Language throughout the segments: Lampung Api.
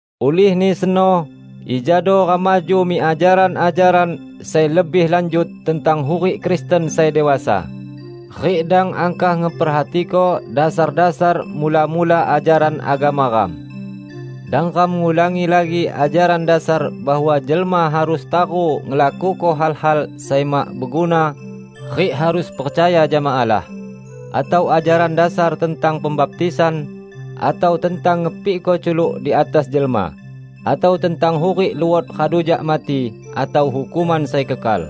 Ulihni seno, ijado ram maju mik ajaran-ajaran sai lebih lanjut tentang hurik Kristen sai dewasa, rik dang angkah ngeperhatiko dasar-dasar mula-mula ajaran agama ram. Dang ram ngulangi lagi ajaran dasar bahwa jelma harus taru ngelakuko hal-hal sai mak beguna rik harus percaya jama Allah, atau ajaran dasar tentang pembaptisan atau tentang ngepikko culuk di atas jelma, atau tentang hurik luot radu jak mati atau hukuman sai kekal.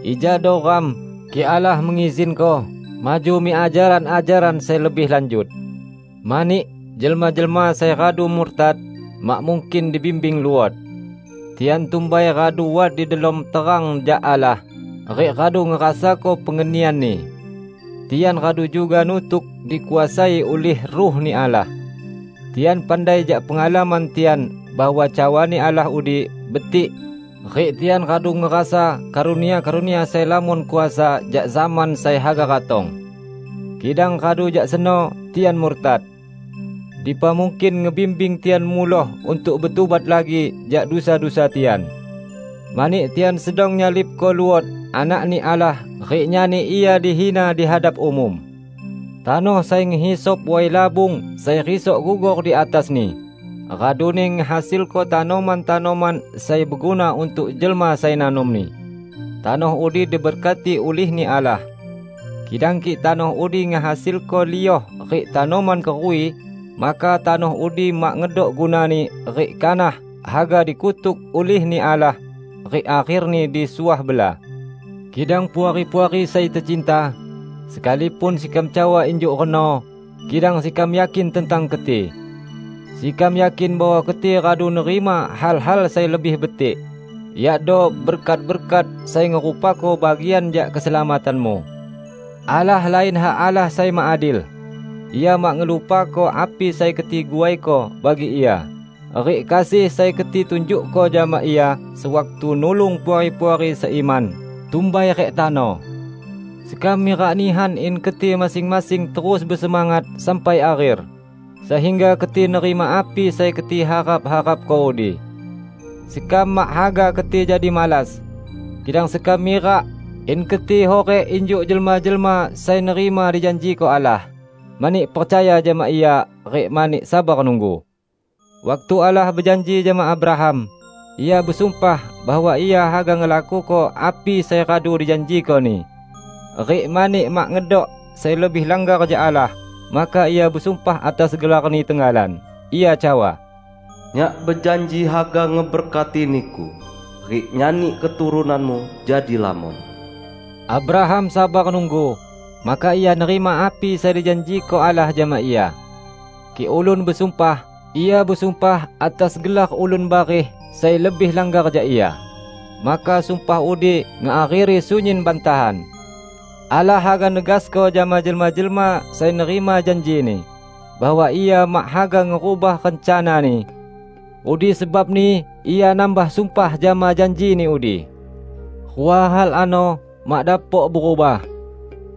Ijado ram, kik Allah mengizinko, maju mik ajaran-ajaran sai lebih lanjut! Mani, jelma-jelma sai radu murtad, mak mungkin dibimbing luot. Tian tumbai radu wat di delom terang jak Allah, rik radu ngerasako pengenian-Ni. Tian radu juga nutuk dikuasai ulih Ruh-Ni Allah. Tian pandai jak pengalaman tian bahwa cawa-Ni Allah udi betik rik tian radu ngerasa karunia-karunia sai lamon kuasa jak zaman sai haga ratong. Kidang radu jak seno tian murtad! Dipa mungkin ngebimbing tian muloh untuk betubat lagi jak dusa-dusa tian. Mani tian sedang nyalibko luot Anak-Ni Allah rik nyani Ia dihina di hadap umum. Tanoh sai ngehisap way labung sai risok gugor di atasni, raduni ngehasilko tanoman-tanoman sai beguna untuk jelma sai nanomni, tanoh udi diberkati ulih-Ni Allah. Kidang kik tanoh udi ngehasilko lioh rik tanoman keruwi, maka tanoh udi mak ngedok gunani rik kanah haga dikutuk ulih-Ni Allah rik akherni disuah bela. Kidang Puari-puari sai tecinta, sekalipun sekam cawa injuk reno, kidang sekam yakin tentang keti. Sekam yakin bahwa keti radu nerima hal-hal sai lebih betik, yakdo berkat-berkat sai ngerupako bagian jak keselamatanmu. Allah lain hak Allah sai mak adil. Ia mak ngelupako api sai keti guaiko bagi Ia, rik kasih sai keti tunjukko jama Ia sewaktu nulung puari-puari seiman, tumbai rik tano. Sekam mirak nihan in keti masing-masing terus besemangat sampai akher, sehingga keti nerima api sai keti harap-harapko udi. Sekam mak haga keti jadi malas. Kidang sekam mirak in keti hurik injuk jelma-jelma sai nerima dijanjiko Allah, mani percaya jama Ia rik mani sabar nunggu. Waktu Allah bejanji jama Abraham, Ia besumpah bahwa Ia haga ngelakuko api sai radu dijanjiko-Ni. Rik mani mak ngedok sai lebih langgar jak Allah, maka Ia besumpah atas gelar-Ni tenggalan. Ia cawa, "Nyak bejanji haga ngeberkati niku rik nyani keturunanmu jadi lamon." Abraham sabar nunggu, maka ia nerima api sai dijanjiko Allah jama ia. Kik ulun besumpah, ia besumpah atas gelar ulun bareh sai lebih langgar jak ia, maka sumpah udi ngeakheri sunyin bantahan. Allah haga negasko jama jelma-jelma sai nerima janji-Ni, bahwa Ia mak haga ngerubah rencana-Ni. Udi sebabni Ia nambah sumpah jama janji-Ni udi. Rua hal ano mak dapok berubah: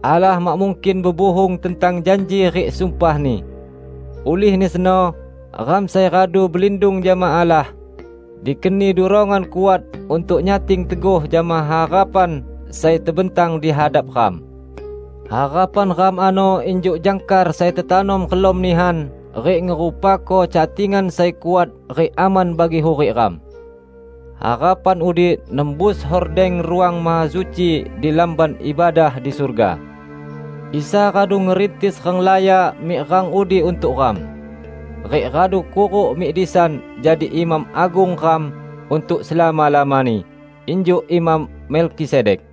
Allah mak mungkin bebuhung tentang janji rik sumpah-Ni. Ulihni seno, ram sai radu belindung jama Allah, dikeni durongan kuat untuk nyating teguh jama harapan sai tebentang di hadap ram. Harapan ram ano injuk jangkar sai tetanom relam nihan rik ngerupako catingan sai kuat rik aman bagi hurik ram. Harapan udi nembus hordeng Ruang Mahasuci di Lamban Ibadah di surga. Isa radu ngerintis ranglaya mik rang udi untuk ram, rik radu kuruk mik disan jadi Imam Agung ram untuk selama-lamani, injuk Imam Melkisedek.